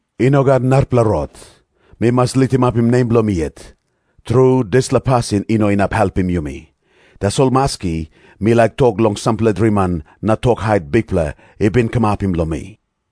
I no gat narapela rot. Mi mas litimapim nem bilong mi yet. Tru, dispela pasin i no inap helpim yumi. Tasol maski, mi laik tok long sampela driman na tok hait Bikpela i bin kamapim long mi.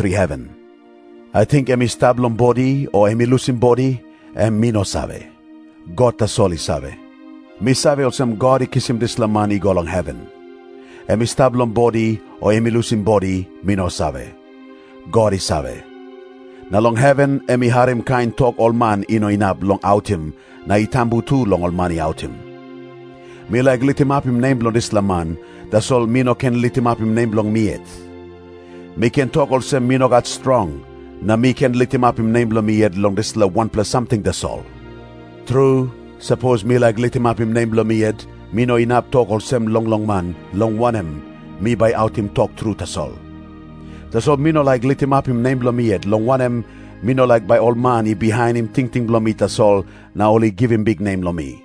heven. Ating em i stap long bodi o em i lusim bodi, em mi no save. God tasol i save. 3Mi save olsem God i kisim dispela man i go long heven. Em i stap long bodi o em i lusim bodi, mi no save. God i save. Na long heven em i harim kain tok ol man i no inap long autim, na i tambu tu long man i autim. Mi laik litimapim nem bilong dispela man, tasol mi no ken litimapim nem bilong mi yet. Mi ken tok olsem mi no gat strong, na mi ken litimapim nem bilong mi yet long dispela wanpela samting tasol. Tru, sapos mi laik litimapim nem bilong mi yet, mi no inap tok olsem longlong man, long wanem, mi bai autim tok tru tasol. Tasol mi no laik litimapim nem bilong mi yet, long wanem, mi no laik bai ol man i bihainim tingting bilong mi tasol na ol i givim biknem long mi.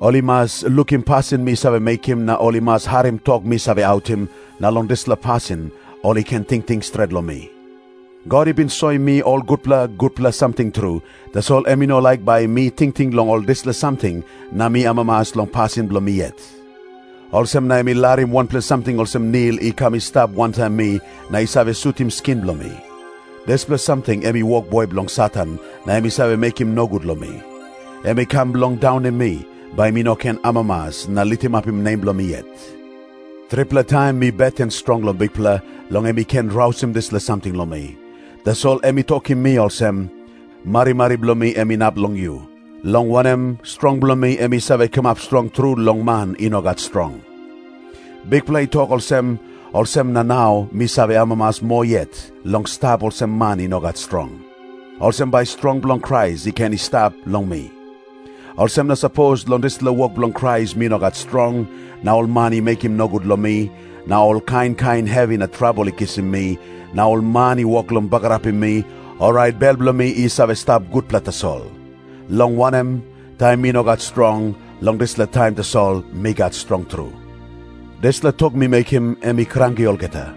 Ol i mas lukim pasin mi save mekim na ol i mas harim tok mi save autim, na long dispela pasin ol i ken tingting stret long mi. God i bin soim mi ol gutpela gutpela samting tru, tasol em i no laik bai mi tingting long ol dispela samting na mi amamas long pasin bilong mi yet. Olsem na em i larim wanpela samting olsem nil i kam i stap wantaim mi na i save sutim skin bilong mi. Dispela samting em i wokboi bilong Satan, na em i save mekim nogut long mi. Em i kam bilong daunim mi, bai mi no ken amamas na litimapim nem bilong mi yet. Tripela taim mi beten strong long Bikpela, long em i ken rausim dispela samting long mi. Tasol em i tokim mi olsem, “Marimari bilong mi em inap long yu. Long wanem, strong bilong mi em i save kamap strong tru long man i no gat strong.” Bikpela i tok olsem, olsem na nau mi save amamas moa yet long stap olsem man i no gat strong. Olsem bai strong bilong Krais i ken i stap long mi. Olsem na sapos long dispela wok bilong Krais mi no gat strong, na ol man i mekim nogut long mi, na ol kain kain hevi na trabel i kisim mi, na ol man i wok long bagarapim mi, orait bel bilong mi i save stap gutpela tasol. Long wanem, taim mi no gat strong, long dispela taim tasol mi gat strong tru. Dispela tok mi mekim, em i kranki olgeta.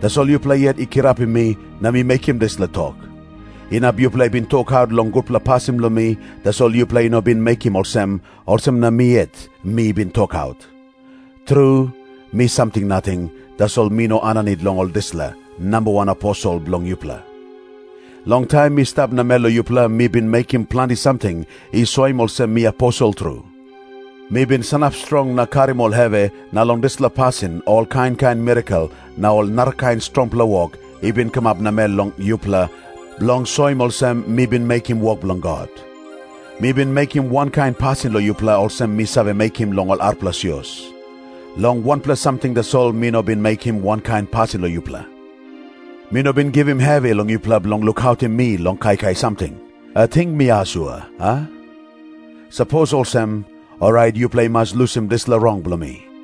Tasol yupela yet i kirapim mi na mi mekim dispela tok. Inap yupela i bin tokaut long gutpela pasin bilong mi, tasol yupela i no bin mekim olsem, olsem na mi yet mi bin tokaut. Tru, mi samting nating, tasol mi no aninit long ol dispela “namba wan aposel” bilong yupela. Long taim mi stap namel long yupela mi bin mekim planti samting i soim olsem mi aposel tru. Mi bin sanap strong na karim ol hevi, na long dispela pasin ol kain kain mirakel na ol narakain strongpela wok i bin kamap namel long yupela, bilong soim olsem mi bin mekim wok bilong God. Mi bin mekim wankain pasin long yupela olsem mi save mekim long ol arapela sios. Long wanpela samting tasol mi no bin mekim wankain pasin long yupela. Mi no bin givim hevi long yupela bilong lukautim mi long kaikai samting. Ating mi asua, a? Sapos olsem, orait yupela i mas lusim dispela rong bilong mi.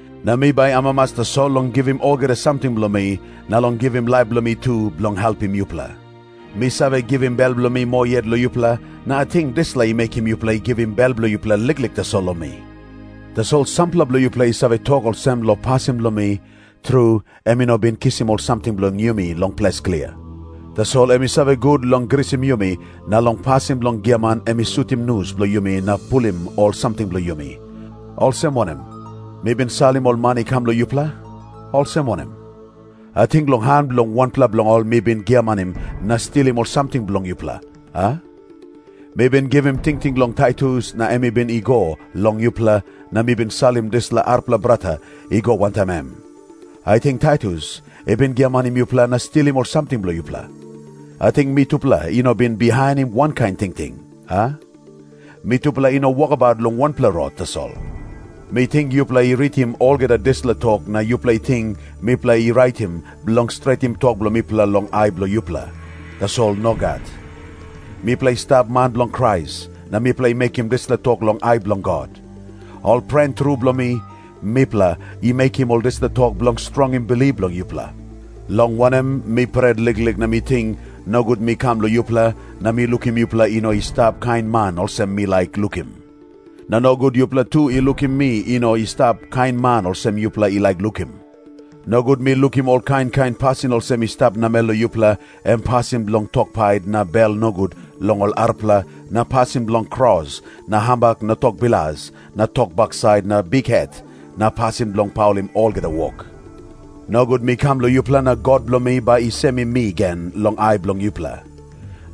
Na mi bai amamas tasol long givim olgeta samting bilong mi, na long givim laip bilong mi tu, bilong helpim yupela. Mi save givim bel bilong mi moa yet long yupela, na ating dispela i mekim yupela i givim bel bilong yupela liklik tasol long mi? Tasol sampela bilong yupela i save tok olsem long pasin bilong mi, “Tru, em i no bin kisim ol samting bilong yumi long ples klia. Tasol em i save gut long grisim yumi, na long pasin bilong giaman em i sutim nus bilong yumi na pulim ol samting bilong yumi.” Olsem wanem? Mi bin salim ol man i kam long yupela. Olsem wanem? Ating long han bilong wanpela bilong ol mi bin giamanim na stilim ol samting bilong yupela, a? Mi bin givim tingting long Taitus na em i bin i go long yupela, na mi bin salim dispela arapela brata i go wantaim em. Ating Taitus i bin giamanim yupela na stilim ol samting bilong yupela? Ating mitupela i no bin bihainim wankain tingting, a? Mitupela i no wokabaut long wanpela rot tasol? Mi ting yupela i ritim olgeta dispela tok na yupela i ting mipela i raitim bilong stretim tok bilong mipela long ai bilong yupela. Tasol nogat. Mipela i stap man bilong Krais, na mipela i mekim dispela tok long ai bilong God. Ol pren tru bilong mi, mipela i mekim ol dispela tok bilong strongim bilip bilong yupela. Long wanem, mi pret liklik na mi ting, nogut mi kam long yupela na mi lukim yupela i no i stap kain man olsem mi laik lukim. Na nogut yupela tu i lukim mi i no i stap kain man olsem yupela i laik lukim. Nogut mi lukim ol kain kain pasin olsem i stap namel long yupela, em pasin bilong tok pait na bel nogut long ol arapela na pasin bilong kros na hambak na tok bilas na tok baksait na bikhet na pasin bilong paulim olgeta wok. Nogut mi kam long yupela na God bilong mi bai i semim mi gen long ai bilong yupela.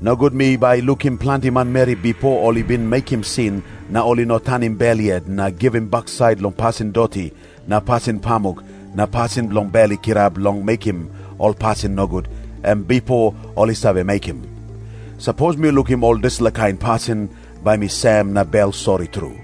Nogut mi bai lukim planti manmeri bipo ol i bin mekim sin na ol i no tanim bel yet na givim baksait long pasin doti na pasin pamuk na pasin bilong bel i kirap long mekim ol pasin nogut, em bipo ol i save mekim. Sapos mi lukim ol dispela kain pasin, bai mi sem na bel sori tru.